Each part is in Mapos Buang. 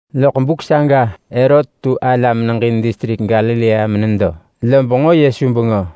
Vu buk saga Herot tu distrik Galilea ala menedo, benġo Yesu bengö.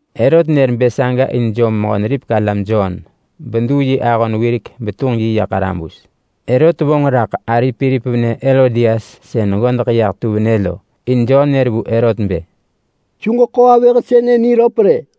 Herot nër bë saga in jom Mehö-neripek-alam Jon beduu yi ahon wirek betunġ yi ya ḳarabus. Herot vonġ raḳ ari Pilip venë Herodias sën ggodeḳ yah tu venë lo. In Jon nër vu Herot bë, “Su ġeḳo avëh sënë niröp rë!”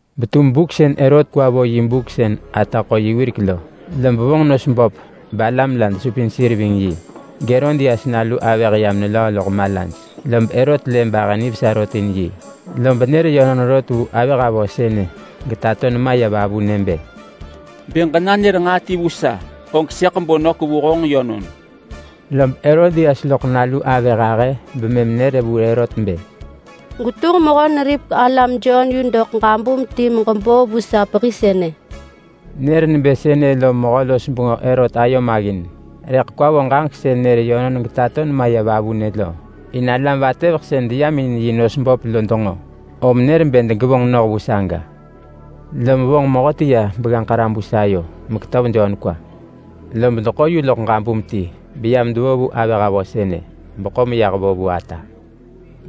Betum buk sën Herot kwa vo yi buk sën ata ḳo yi wirek lo, lob vonġ nos böp balam la desupin sir ving yi, geHerodias nalu avëh yam nelöö loḳ malaj. Lob Herot lë bahë nivesa rot in yi, lob nër yönon rot vu avëh avö sënë getato nema ya vavunë bë, “Bë ġenanër nġaa ti vu sa, og sëḳ bo nök vu honġ yönon!” Lob Herodias loḳ nalu avëh ahë bemëm nër vu Herot bë, “Gwetunġ Mehö-neripek-alam Jon yu doḳ ġabum ti meġebo vu sa pehi sënë!” Nër nebë sënë lom mehö-los-bengö Herot ayo maggin, rëḳ kwa vo ġaġek sën nër yönon getato nema ya vavunë lo, in neggönengin alam vatëveḳ sën deyam in yi nos böp lo denġo. Lob nër bë degevonġ noh vu saga. Lom vonġ mehöti ya begganġ ḳarabus ayo meketöv Jon kwa. Lob deḳo yu loḳ ġabum ti beyam devo vu avëh avö sënë, beḳo meyah vo vu ata.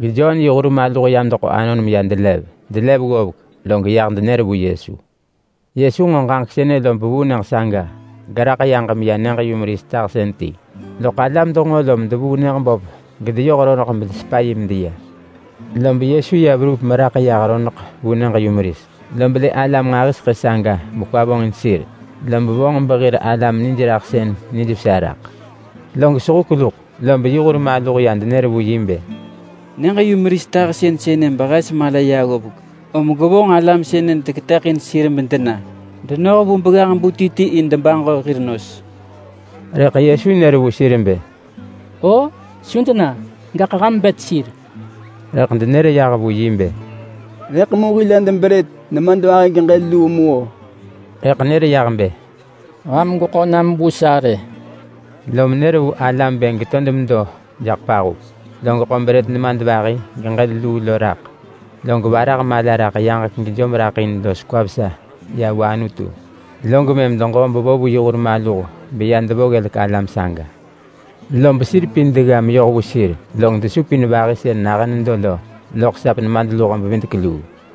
GeJon yi hur maluh yam deḳo anon meya delev. Delev ggovek, log ya denër vu Yesu. Yesu nġo ġaġek sënë lob vuu nyëġ saga geraḳ yaġ meya nyëġ-yumeris tahsën ti. Loḳ alam denġo lom devuu nyëġ böp gedeyoh roneḳ bedesepa yi medeya. Lob Yesu ya verup meraḳ yah roneḳ vu nyëġ-yumeris, lob lë alam nġahiseḳë saga bekwa vonġin sir, lob vonġ behir alam nijraḳsën nijvesa raḳ. Log sehuk luḳ lob yi hur maluh ya denër vu yi bë, “Nyëġ-yumeris tahsën sënë behes mala ya ggovek, om gwevonġ alam sënë deketëḳin sir medena denoh vu begganġ-bu ti ti in debaġo hir nos.” Rëḳ Yesu nër vu sir bë, “O, su dena! Gaḳ ham bet sir!” Rëḳ denër yah vu yi bë, “Rëḳ mu hil hed brët nemadvahi geġël luu mu-o!” Rëḳ nër yah bë, “Ham gweḳo nam vu sa rë!” Lom nër vu alam bë degeto demedo jaḳ pahup, log ḳo brët nemadvahi geġël luu lo raḳ, log varah mala raḳ yaġek gejom raḳ in los kwa vesa ya vu Anutu. Log mëm deġo bevo vu yi hur maluh beya devo ggelek alam saga. Lob sir pin degga meyoh vu sir, log desupin vahi sën nahën nedo lo loḳ sap nemadluho-bevidek-luu.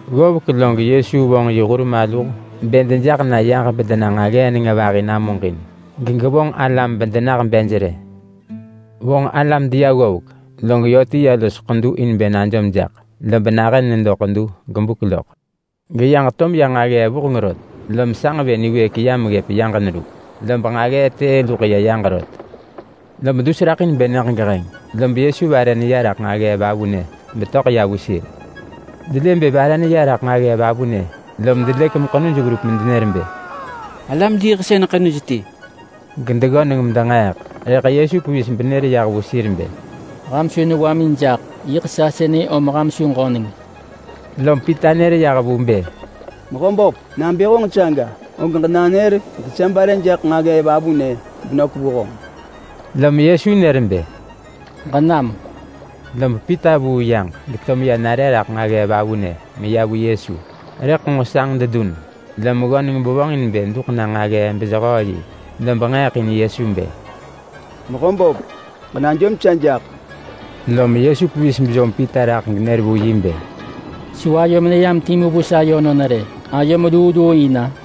Ggovek log Yesu vonġ yi hur maluh bë dejaḳ na yaġ bedena nġaggee nenga vahi namuġin, gegevonġ alam bedenah bej rë. Vonġ alam deya ggovek, log yö ti ya los ḳedu in bë najom jaḳ, lob nahën ya nedo ḳedu gebuk loḳ. Geyaġ to meya nġaggee vuheng rot, lom sanġ vë niwëëk yam ggëp yaġ neru, lob nġaggee tëë luḳ ya yaġ rot. Lob dus raḳ in bë nyëġ geheng, log Yesu vare neya raḳ nġaggee vavunë betöḳ ya vu sir. Delë bë vare neya raḳ nġaggee vavunë, lom delëk meḳenuj verup medenër bë, “Alam diiḳsën ḳenuj ti!”, gedeggöneng medenġeeḳ. Rëḳ Yesu pevis benër ya vu sir bë, “Ham su newamin jaḳ! Yiḳ sa sënë om ham su ġöneng.” Lom Pita nër yah vu bë, “Mehöböp! Nabë honġ saga, og ġenanër gesa bare jaḳ nġaggee vavunë benök vu honġ!” Lom Yesu nër bë, “Ġenam!” Lob Pita vuu yaġ geto meya nare raḳ nġaggee vavunë meya vu Yesu, rëḳ nġo sanġ dedun, lom ggöneng bevonġin bë duḳ na nġaggee benġaggee jehöö yi. Lob nġeeḳ in Yesu bë, “Mehöböp, ġenajom sa jaḳ!” Lom Yesu pevis bejom Pita raḳ genër vu yi bë, “Su ayom neyam timu vu sa yönon rë! Ayom luu luu in-a?”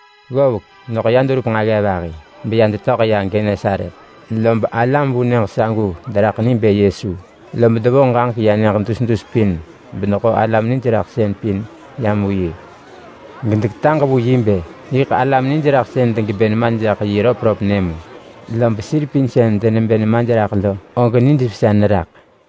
Ggovek, loḳ ya deverup nġaggee vahi beya detöḳ ya Genesaret, lob alam vu nyëġ sagu deraḳ ni bë Yesu, lob devonġ ġaġek ya nyëġ dus dus pin bedeḳo alam nijraḳsën pin yam vu yi. Gedeketaġ vu yi bë yiḳ alam nijraḳsën degebë nemaj jaḳ yi röpröp nyë mu. Lob sir pin sën denebë nemaj raḳ lo og nijvesa neraḳ.